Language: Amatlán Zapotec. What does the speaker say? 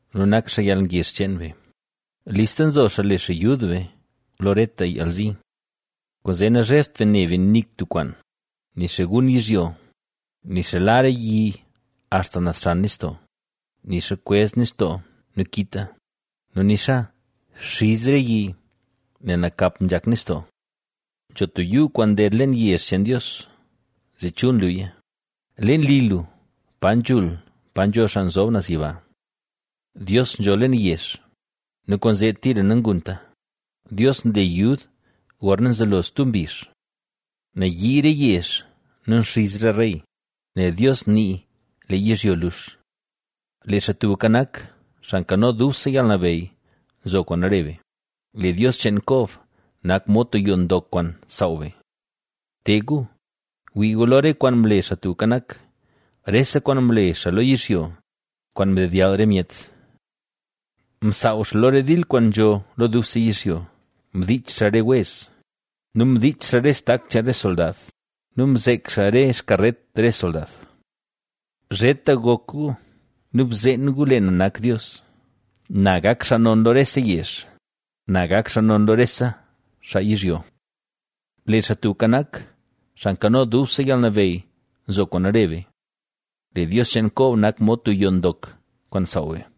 nu nak xaa yalngezh cheen be, listla nzo xaa le xaa yud be lo reta yalzi. Kwaanzee nazhebt be ne be nik tub kwaan, nixa gun yizhyo, nixa la re yi axta naz xan nistoo, nixa kwezh nistoo nu kita nu nixa xiz re yi nel nakap nzhak nistoo. Nzho tub yuu kwaan nded leen yezh cheen Dios zee chul nluya, leen li lu, pa nzhul pa nzho Xaa Nzob Naz Yiba. Dios nzho leen yezh nu kwaanzee tira nangunta. Dios nle yud gorna nzelo stub mbizh. Nayii re yezh nu nxiz re rey, nel Dios nii lee yizhyo lux. Lee Xaa Tubka Nak, Xaa Nkano Dubse Yalnabeyy, nzo kwaan re be; lee Dios cheen Kob nak mod tub yoo ndok kwaan saaw be. Te gu, gwii gu lo re kwaan mle Xaa Tubka Nak rese kwaan mle xaa lo yizhyo, kwaan mdedyall re myet. Msaaw xaa lo re dil kwaan nzho lo dubse yizhyo, mdiich xaa re wez nu mdiich xaa re stak cheen re soldad nu mzek xaa re xkaret re soldad. ¡Zheta gok gu nu bzeen gu lee na nak Dios! ¡Na gak xaa non lo rese yezh! ¡Na gak xaa non lo rese xaa yizhyo! Lee Xaa Tubka Nak, Xaa Nkano Dubse Yalnabeyy, nzo kwaan re be; lee Dios cheen Kob nak mod tub yoo ndok kwaan saaw be.